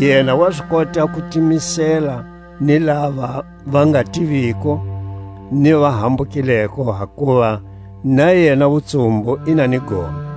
Yena wa zi kota ku timisela ni lava va nga tiviko ni va hambukileko, hakuva na yena wutsumbu i na ni gome;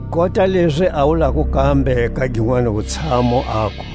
Kota lezi a wulako kambe ka ginwani wutshamu, aku: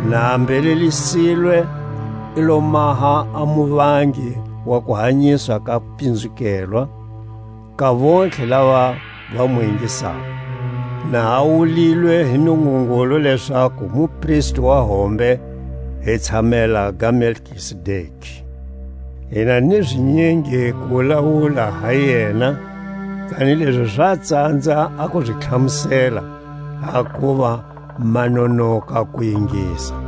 na a mbhelelisilwe i lo maha a muvangi wa kuhanyiswa ka pinzukelwa, ka vontlhe lava va mu ingisako; na a wulilwe hi Nungungulu lezaku mupristi wa hombe hi tshamela ga Melkizedeki. Hi na ni zinyingi ku wulawula ha yena, kanilezi za tsanza a ku zi tlhamusela, hakuva ma nonoka ku ingisa.